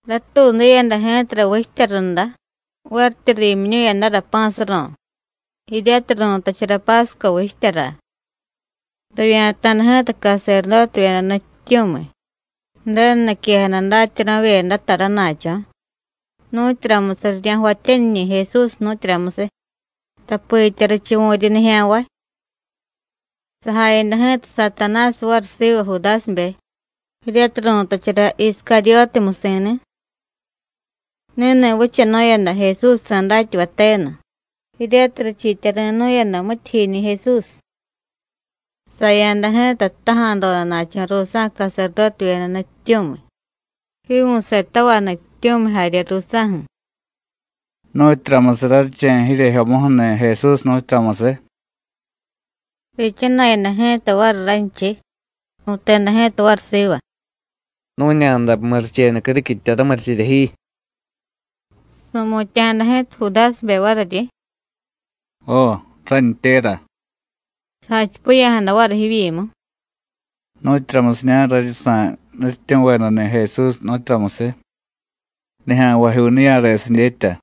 Ratuudiyada ji̱tara vichtya runda, varityi riimyiñu̱yadara pa̱ suro̱, jiryatiy ru̱tachara Pásco vichtyara. Rivya̱ta̱da ji̱ta caserdótevyeda nutyityu̱miy, Ju̱denu niquejada datyanuvavyedata rana̱cho̱, nu̱tyuramusiy rirya̱jvatyaniñi̱ Jesús, nu̱tyuramusiy, tapitya richuvu̱ryi nijya̱nvay. Sajayada ji̱ta Satanásiy variy siva Judásibe, jiryatiy ru̱tachara Iscaryótiy musi̱ni̱. Ni̱ni̱ vichanu̱yada Jesúsjsa̱ datyavay tenu, jiryatiy richiityari̱nu̱yada mityijyiñi̱ Jesús. Saya̱da ji̱ta jtaja̱dodana̱cho̱ ruusa̱ caserdótevyeda nutyityu̱miy, jiivu̱setavay nutyityu̱miy jarye ruusa̱ju̱: “¿Nu̱tyuramusiy raryiche̱ jiryejyomuju̱ni̱ Jesús, nu̱tyuramusiy?” Riichana̱yada ji̱ta variy ranchiy, ru̱teda ji̱ta variy siva: “Nu̱ña̱day murichenu criquitya ramurichirya ji.” Su̱mutya̱jada ji̱ta Judásibe variryi: “Jo, rántyéra.” Sajachipiya̱jada variy jivyimu: “¿Nu̱tyuramusiña̱ raryi sa̱y nutyityu̱vedani̱ Jesús, nu̱tyuramusiy? nijya̱nvajyuu niya̱resiy dyetya.”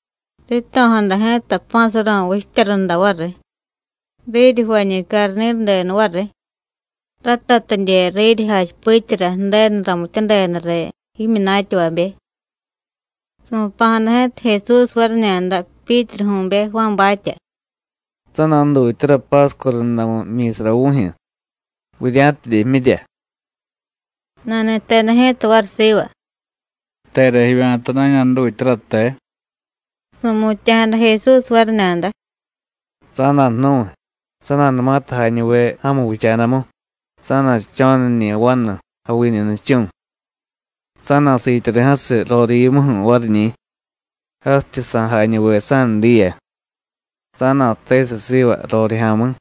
Rito̱jada ji̱ta Pa̱ Suro̱ vichtya runda variy. Riryi jvañi̱ carni̱rudenu variy, ratatidye riryi jachipityara Ju̱denu ramityadeda riy jimyunatyavabe. Su̱pa̱jada ji̱ta Jesús variñada Pyítruju̱be Juánbatya: “Sa̱na̱jdutyara Pásco rundamu jmyi̱sara vu̱jyu̱, vurya̱tidye jmyirya.” Nani̱teda ji̱ta variy siva: “¿Tera jivya̱ta na̱ña̱jdutyara, te?” Su̱mutya̱jada Jesús variñada: “Sa̱na̱jnu̱y, sa̱na̱numatiy jañuve ja̱mu vicha̱damu sa̱na̱jdcho̱niñi̱ vanu, javiñu nichu̱. Sa̱na̱siityari̱ jasiy rorivyimuju̱ variñi̱, jasityi sa̱jañuve sa̱nudiya. Sa̱na̱jtesiy siva rorijya̱mi̱: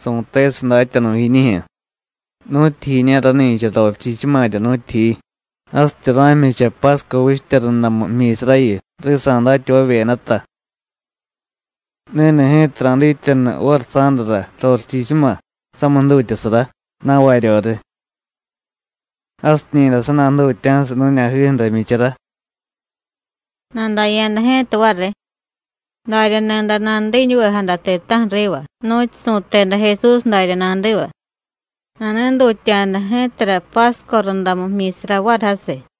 Su̱tesiy Datyanu̱ jiñijyu̱: ¿Nu̱tyijiña̱ rani̱cha rorichichumarya, nu̱tyijiy? jasityi ra̱jmyicha Pásco vichtya rundamu jmyi̱sarayu, risa̱ datyavavyedata. Ni̱ni̱ ji̱ta ra̱dityanu variy sa̱dara rorichichuma samiy jdutyasara, na̱varyoriy. Jasiñi̱day sa̱na̱jdutya̱siy nu̱ña̱jiju̱ra jmyichara.” Nadaya̱da ji̱ta variy, darya ni̱day nanudiñuvejada ti̱ta̱ju̱ riva, nu̱tyu su̱teda Jesús darya nadiva. Nani̱dutya̱da ji̱tara Pásco rundamu jmyi̱sara variy jasiy.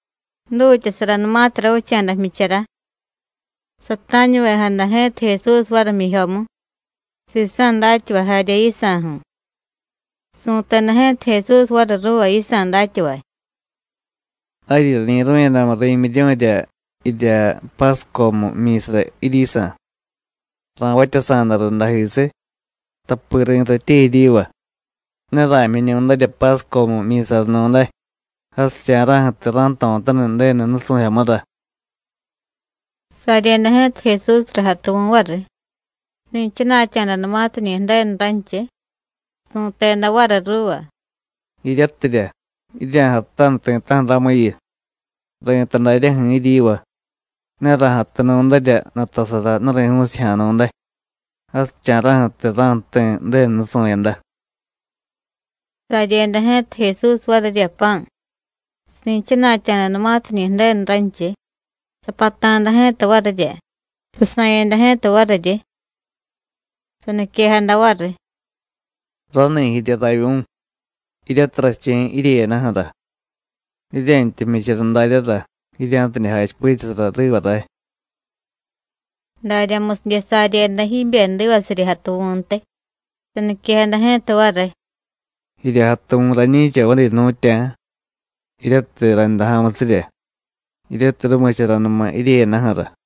Jdutyasaranumatiy ravicha̱da jmyichara, sata̱ñuvejada ji̱ta Jesús variy jmyijyomu, sisa̱ datyavay jarye yisa̱ju̱. Su̱teda Ji̱ta Jesús variy ruuva yisa̱ datyavay: “Jaryi rañi̱ru̱yadamu ri̱myiryu̱rya jirya Páscomu jmyi̱sara jiryisa̱, ra̱vatyasa̱da rundajisiy, tapi ri̱tatye jiryiva: Ne ra̱jmyiñu̱darya Páscomu jmyi̱saranu̱day, jasicha̱ra̱ju̱tiy ra̱jto̱taniy Ju̱denu nusu̱jyomura.” Saryeda ji̱ta Jesúsra jatuvu̱ variy, si̱chana̱tya̱danumatiñi̱ Ju̱denu ranchiy, su̱teda variy ruuva: “Jiryatirya, jirya̱jatutaniy ti̱ta̱ju̱ ramuyu, ri̱tay daryaju̱ jiryiva: Ne ra̱jatunu̱darya nutasara nuri̱ju̱u̱sijya̱ nu̱day, jasicha̱ra̱ju̱tiy ra̱jti̱ Ju̱denu nusu̱yada.” Saryeda ji̱ta Jesús varirya pa̱, si̱chana̱tya̱danumatiñi̱ Ju̱denu ranchiy, sapata̱da ji̱ta varirya, sasa̱yada ji̱ta variryi. Saniquejada variy: “Rani̱ jirya ravyu̱, jiryatiy rache̱y jiryeyadaju̱ra. Jirye̱ntya jmyichara daryara, jirya̱tidye jachipityasara riva ray.” Daryamusidye saryeda jibyedivasirya jatuvu̱ntiy, saniquejada ji̱ta variy: “Jirya jatuvu̱ rañi̱cha vadi jnu̱tya̱, jiryatiy rayndaja̱musirya, jiryatiy rumicharanuma jiryeyadaju̱ra.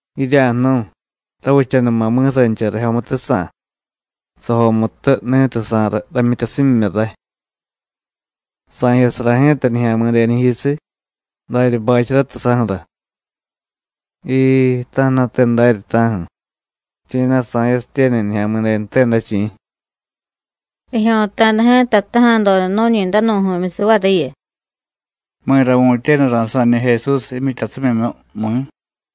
Jirya̱jnu̱y, ravichanuma mi̱sancha rajyomutujsa̱, sajomutu ni̱tiy sa̱y ramyityasimyimyu ray. Sa̱jyasara ji̱ta Nijya̱mi̱denu jiyusiy, darya bacharatiy saju̱ra. Jiii, ta̱ju̱na̱te darya, ta̱ju̱, chi̱na̱ sa̱yasitye ni̱ Nijya̱mi̱denute day, chi̱.” Rijyo̱ta̱da ji̱ta jtaja̱doda nu̱ñi danu̱ju̱myusiy variyu: “¿Mi̱ra vu̱tyenu ra̱sa̱ñi̱ Jesús jimyityasimyimyu, mi̱?”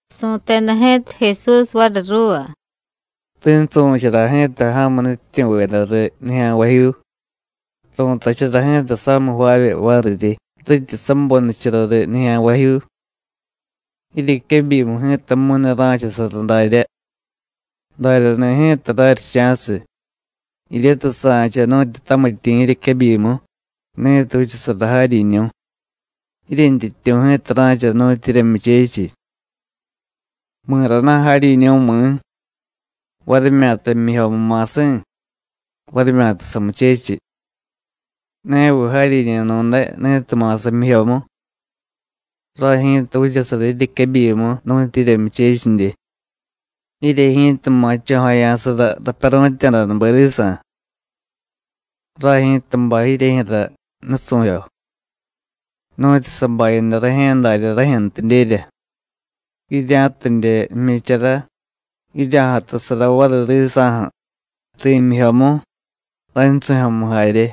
Su̱teda ji̱ta Jesús variy ruuva: “Rinsu̱chara ji̱ta ja̱mu nutyityu̱veda riy nijya̱nvajyuu. Ru̱tachara ji̱ta samiy jvaavye variryi, rityi sabonichara riy nijya̱nvajyuu. Jiryequebyimu ji̱tamu̱y ne ra̱chasara daryá; daryani̱ ji̱ta raryicha̱siy, jiryatiy sa̱cha nu̱tyu tamityi̱ jiryequebyimu ni̱tiy vichasara jaryiñu̱; jiryentyityu̱ ji̱ta ra̱cha nu̱tyu jiryemyuchechiy. ¿Mi̱rana̱ jaryiñu̱, mi̱? varimyata jmyijyomu ma̱si̱, varimyata samuchechiy. ¿Ne viy jaryiñu̱nu̱day ni̱tiy ma̱sa jmyijyomu? Ray ji̱ta vichasara jiryequebyimu nu̱tyu jiryemyuchechidye. Jirye ji̱ta ma̱cho̱jaya̱sara rapyaru̱tya̱danube risa̱. Ray ji̱ta bay jiryejyu̱ra nusu̱jyo, nu̱tyu sabayada rajye̱ darya rajyu̱ntidyerya, jirya̱tidye jmyichara, jirya̱jatusara variy risa̱ju̱ ri̱myijyomu, raynsu̱jyomu jarye.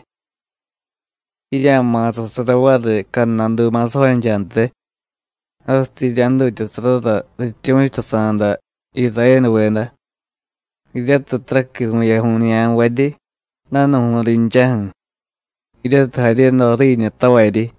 Jirya̱ma̱sasara variy cadnadu ma̱sajonchantiy, jasityi jirya̱jdutyasarara rityu̱chutasa̱da Irayénuveda, jiryatiy taraqui vu̱yaju̱y nijya̱nvaryi, danu̱ju̱y rinchaju̱, jiryatiy jaryedo ju̱riiñutavaryi.”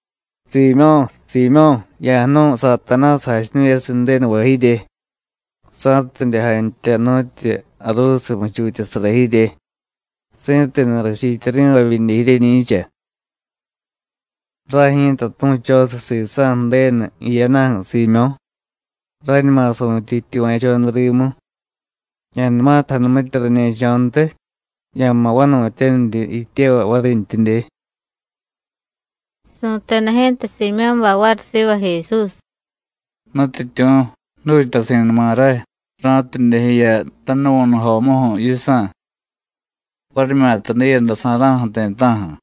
“Siimyó̱, Siimyó̱, ya̱jnu̱y Satanásiy jachiñu̱yasiy Ju̱denuva jirye, sa̱tidye jantya nu̱tyu jaruusiy muchutyasara jirye, si̱tenu rachiityari̱vay vidye jiryeñi̱cha. Ray ji̱ta tu̱chosiy sisa̱ Ju̱denu jiyadaju̱, Siimyó̱, ráñuma su̱tye jityuva̱choda rimu. Ya̱numatiy janumitye rañe̱cho̱ntiy, ya̱ma̱ vanu̱tyaniryi jityevay varintyidye.” Su̱teda ji̱ta Siimyó̱bay variy siva Jesús: “Nutyityu̱, jdutyasi̱numa ray, ra̱tidye jiya tanuvu̱nujomuju̱ yisa̱, varimyata diiyadasa̱ra̱ju̱ ti̱ta̱ju̱.”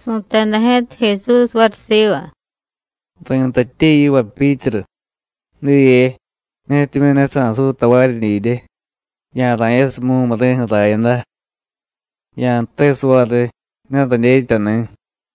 Su̱teda ji̱ta Jesús variy siva: “Ri̱tatye yiva Pyítru, diye, netimyu̱ ne sa̱suy tavaryi didye, ya̱ra̱yasiy mumuri̱ju̱ rayada. Ya̱jtesiy variy: Ne radyetyani̱.”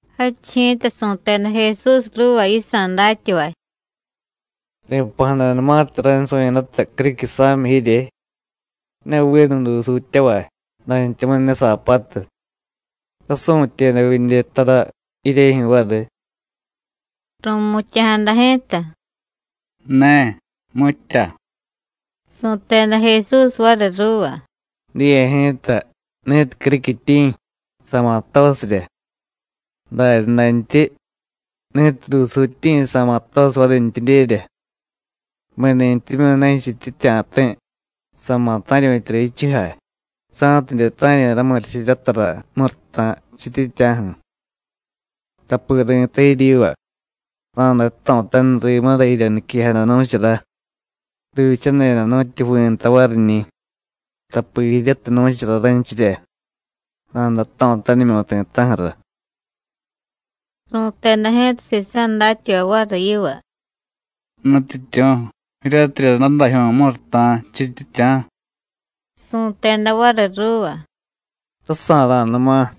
Jadchiy ji̱ta su̱teda Jesús ruuva yisa̱ datyavay: “Ri̱pa̱jadanumatiy raynsu̱yadata criquisa̱miy jirye, ne vinu dusuutyavay, dantyamu̱y ne saapatu, ¿rásu̱tyeda vidye tara jiryejyu̱ variy?” Ru̱mutya̱jada ji̱ta: “Ne, mitya.” Su̱teda Jesús variy ruuva: “Diye ji̱ta, ni̱tiy criquityi̱, sa̱ma̱ jtosirya; daryadantyi, ni̱tiy dusuutyi̱, sa̱ma̱ jtosiy varintyidyerya. Mi̱nintyimyu̱ ne jichityitya̱ ti̱, sa̱ma̱ ta̱ryu̱tyara jichujay, sa̱tidye ta̱ryu̱y ramurichiryatara muruta̱ jichityitya̱ju̱. Tapi ri̱tay jiryiva: Ra̱day jto̱taniy rimura jirya niquejada nu̱chara: Rivyichadeda nu̱tyu jvi̱ nta variñi̱, tapi jiryatiy nu̱chara raynchirya, ra̱day jto̱tanimyu̱y ti̱ta̱ju̱ra.” Ru̱teda ji̱ta sisa̱ datyavay variy yiva: “Nutyityu̱, jiryatirya dadajyu̱y muruta̱ jichityitya̱.” Su̱teda variy ruuva: “Rasa̱ra̱numa.”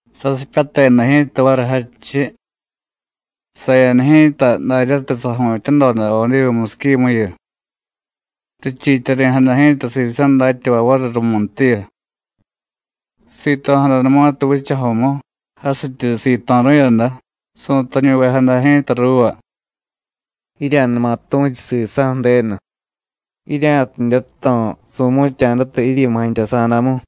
Sasipyateda ji̱ta variy jadchiy, saya̱da ji̱ta daryatiy saju̱tyadoda Odivu musiquimuyu. Richiityari̱jada ji̱ta sisa̱ datyavay variy rumuntiyu. Sito̱jadanumatiy vichajomu, jasityi sito̱ru̱yada, su̱tañuvejada ji̱ta ruuva: “Jirya̱numa tu̱chu sisa̱ Ju̱denu, jirya̱tidye jto̱ su̱mu̱tya̱data jiryimu jantyasa̱damu.”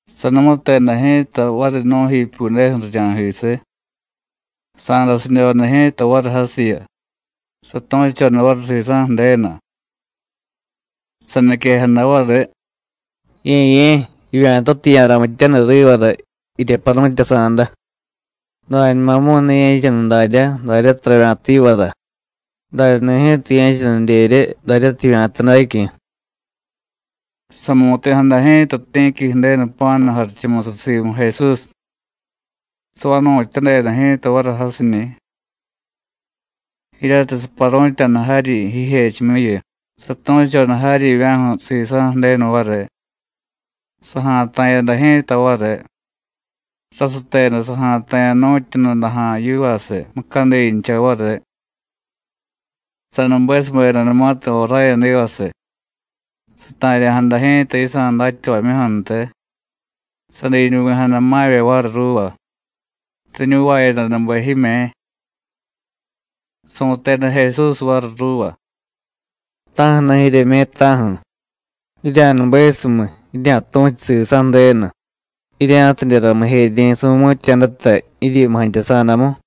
Sanumuteda ji̱ta variy nu̱jipyudeju̱ rirya̱jisiy, sa̱dasidyoda ji̱ta variy jasiyu, satu̱choda variy sisa̱ Ju̱denu. Saniquejada variy: “Ye̱ye̱, jivya̱tatiy, ya̱ramityaniy rivara jirya paru̱tyasa̱da; dañumamu̱y ne ye̱chaniy daryá, daryatiy ravya̱ta yivara, daryani̱ ji̱ta ye̱chanidyerye, daryatiy jivya̱ta dacyu̱.” Samu̱ti̱jada ji̱ta ti̱qui Ju̱denu jpa̱nu jarichumusiy simu Jesús, savanu̱tyadeda ji̱ta variy jasiñi̱. Jiryatiy saparu̱tya̱da jaryi jijechimyuyu, satu̱choda jaryivya̱ju̱ sisa̱ Ju̱denu variy. Saja̱ta̱yada ji̱ta variy, rasuteda saja̱ta̱ya̱ nu̱tyu nudaja̱ yivasiy mucadincha variy. Sanubesubedanumatiy joráyadivasiy, sata̱rya̱jada ji̱ta yisa̱ datyavamyuju̱ntiy, sadiñuvi̱jada ma̱vye variy ruuva, riñuvayadanube jime̱. Su̱teda Jesús variy ruuva: “¿Ta̱ju̱na̱ jiryeme̱, ta̱ju̱? ¡Jirya̱nubesumiy, jirya̱tu̱chu sisa̱ Ju̱denu, jirya̱tidye ramijeryi̱ su̱mu̱tya̱data jiryimu jantyasa̱damu!”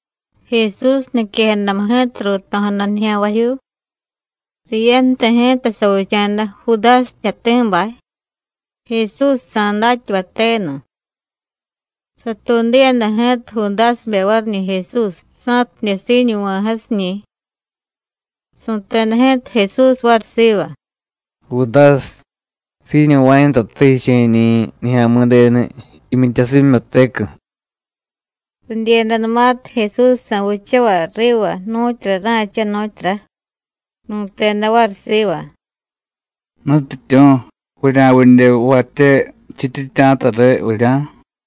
Jesús niquejadamu ji̱ta ruuto̱jada nijya̱nvajyuu. Riyanti̱ ji̱ta savicha̱da Judásiy jtyati̱bay, Jesúsjsa̱ datyavay tenu. Satuudiyada ji̱ta Judásibe variñi̱ Jesús, sa̱tidye siiñuva̱y jasiñi̱. Su̱teda ji̱ta Jesús variy siva: “Judásiy, ¿siiñuva̱yadatate jiche̱ñi̱ Nijya̱mi̱denu jimyityasimyimyutecu̱?” Ridyiyadanumatiy Jesúsjsa̱ vichavay riva nu̱tyura ra̱cha, nu̱tyura, ru̱teda variy siva: “Nutyityu̱, ¿vurya̱vidye jvatye jichityitya̱ta riy, vurya̱?”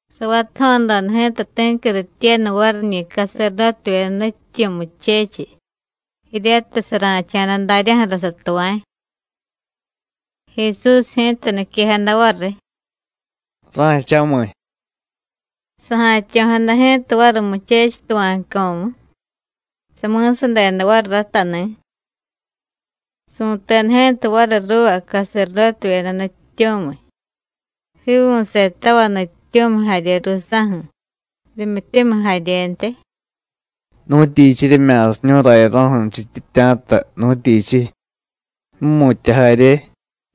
Savatajo̱doda ji̱ta ti̱qui rityenu variñi̱ caserdótevyeda nutyityu̱ muchechiy, jiryatiy sara̱cha̱da daryaju̱ra satuva̱y. Jesús ji̱ta niquejada variy: “¡Ra̱cha̱miy!” Saja̱tyo̱jada ji̱ta variy muchechiy tuva̱cco̱mu, sami̱sadeda variy ratani̱. Su̱teda ji̱ta variy ruuva caserdótevyeda nutyityu̱miy, jiivu̱setavay nutyityu̱miy jarye ruusa̱ju̱, rimyityumiy jaryentiy: “¿Nu̱tyichiy jiryemya̱siñu̱y rayaro̱ju̱ jichityitya̱ta, nu̱tyichiy? ju̱mu̱tya jarye,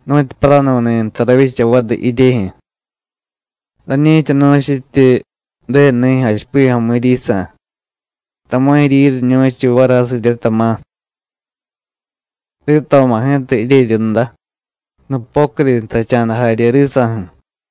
nu̱tyu paranu̱ni̱ nta ravyicha variy jiryejyu̱. Rañi̱chanu̱chityi Ju̱denu nijyu̱ jachipiya̱jomu jiryisa̱, tama̱ jiryiriñu̱chiy variy jasirye, tama̱. Rito̱ma̱ ji̱ta jiryeryunda, nupocudi jtacha̱da jarye risa̱ju̱.”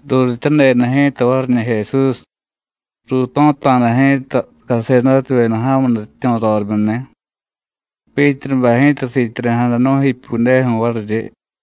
Ruurityadeda ji̱ta variñi̱ Jesús, ruuto̱ta̱da ji̱ta caserdótevyeda ja̱mu nutyityu̱ rorimyuni̱. Pyítrubay ji̱ta siityari̱jada nu̱jipyudeju̱ variryi.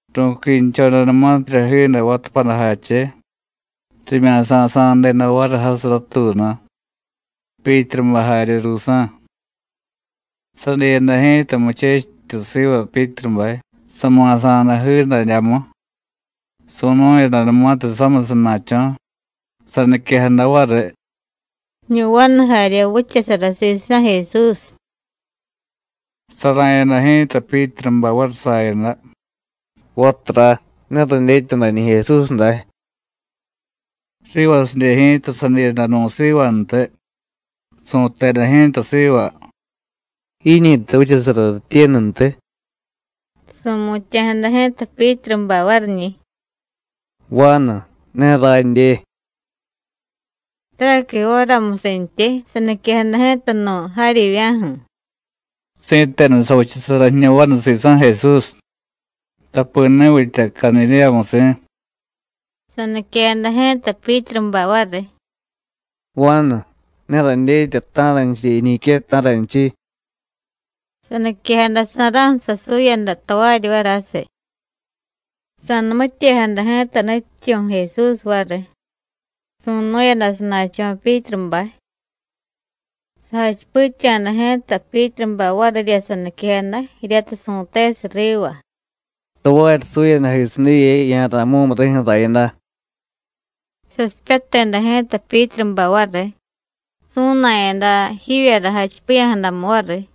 Ru̱quinchodanumatirya jiiday vatapadajache, rimya̱sasa̱deda variy jasiy ratuunu, Pyítrubay jarye ruusa̱. Sadiyada ji̱ta muchechityu siva Pyítrubay, sama̱sa̱da jiidadyamu, su̱nu̱yadanumatiy samiy sana̱cho̱, saniquejada variy: “Jiñu vanu jarye vichasara sisa̱ Jesús.” Sara̱yada ji̱ta Pyítrubay variy sayada: “Vatura, ne radyetya dañi̱ Jesús day.” Rivasidye ji̱ta sadiyada nu̱ sivantiy, su̱teda ji̱ta siva: “¿Jiñi̱ta vichasara rityenuntiy?” Su̱mutya̱jada ji̱ta Pyítrubay variñi̱: “¡Vanu, ne radye!” Taraqui jóramusintyi, saniquejada ji̱ta nu̱ jaryivya̱ju̱: “¡Si̱tenu savichasara jiñu vanu sisa̱ Jesús, tapi ni̱ vitya Cadidéyamusi̱!” Saniquejada ji̱ta Pyítrubay variy: “¡Vanu, ne radyetya ta̱ranchiy jiñique, ta̱ranchiy!” Saniquejadasa̱ra̱ju̱ sasuyada tavaryi variy jasiy. Sa̱numityejada ji̱ta nutyityu̱ Jesús variy, su̱nu̱yada sana̱cho̱ Pyítrubay. Sajachipitya̱da ji̱ta Pyítrubay varirya saniquejada, jiryatiy su̱tesiy riva: “Tavaryi suyadajisiy diye, ya̱ra̱y mumuri̱ju̱ rayada.” Sasipyateda ji̱ta Pyítrubay variy, su̱na̱yada jivyara jachipiya̱jadamu variy.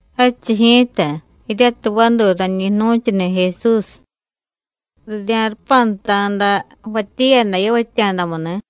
Jadchiy ji̱ta, jiryatiy vaduy rañi jnu̱chuni̱ Jesús, rirya̱rupanta̱da jvatyiyada yavatya̱damuni̱.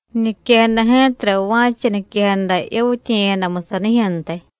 Riñiquejada ji̱tara va̱cha niquejada yavityiye̱yadamu sanijyu̱ntiy.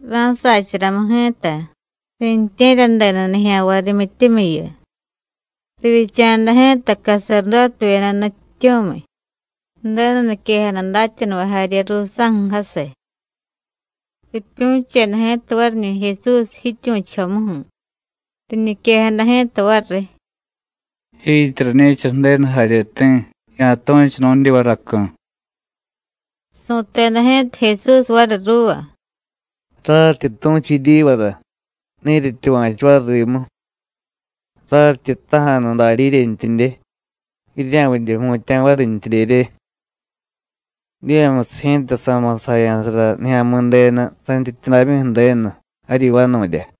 Ra̱sacharamu ji̱ta, riintye̱ryadeda nijya̱nvay rimyityumiyu. Rivyicha̱da ji̱ta caserdótevyeda nutyityu̱miy, Ju̱denu niquejada datyanuvay jarye ruusa̱ju̱ jasiy. Ripyu̱cheda ji̱ta variñi̱ Jesús jityu̱chujomuju̱. Riñiquejada ji̱ta variy: “Jiityi rañi̱cha Ju̱denu jaryeti̱, ya̱tu̱chu nu̱dyivaracu̱.” Su̱teda ji̱ta Jesús variy ruuva: “Raryityi tu̱chu jiryivara, ne jiryetyuva̱chu variy rimu. Raryityi jtaja̱nu darya jiryentyidye, jirya̱vidye jmutya̱ varintyidyerye. Diyemusiy ji̱ta, sa̱ma̱sajaya̱sara Nijya̱mi̱denu santyityudamyu Ju̱denu jaryi vanu̱rya.”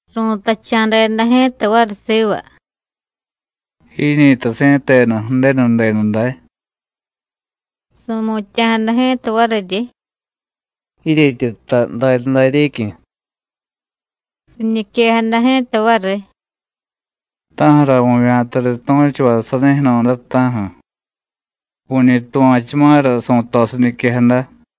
Ru̱tacha̱deda ji̱ta variy siva: “¿Jiñi̱ta si̱tenu Ju̱denu denu day?” Su̱mutya̱jada ji̱ta variryi: “Jiryetyi jtay daryadaryecyu̱.” Riñiquejada ji̱ta variy: “¿Ta̱ju̱ra vu̱vya̱ta riy tu̱chuvay sanijyu̱nu̱day, ta̱ju̱? ¡Vu̱ñi tuva̱chuma̱ra su̱tosiy niquejada!”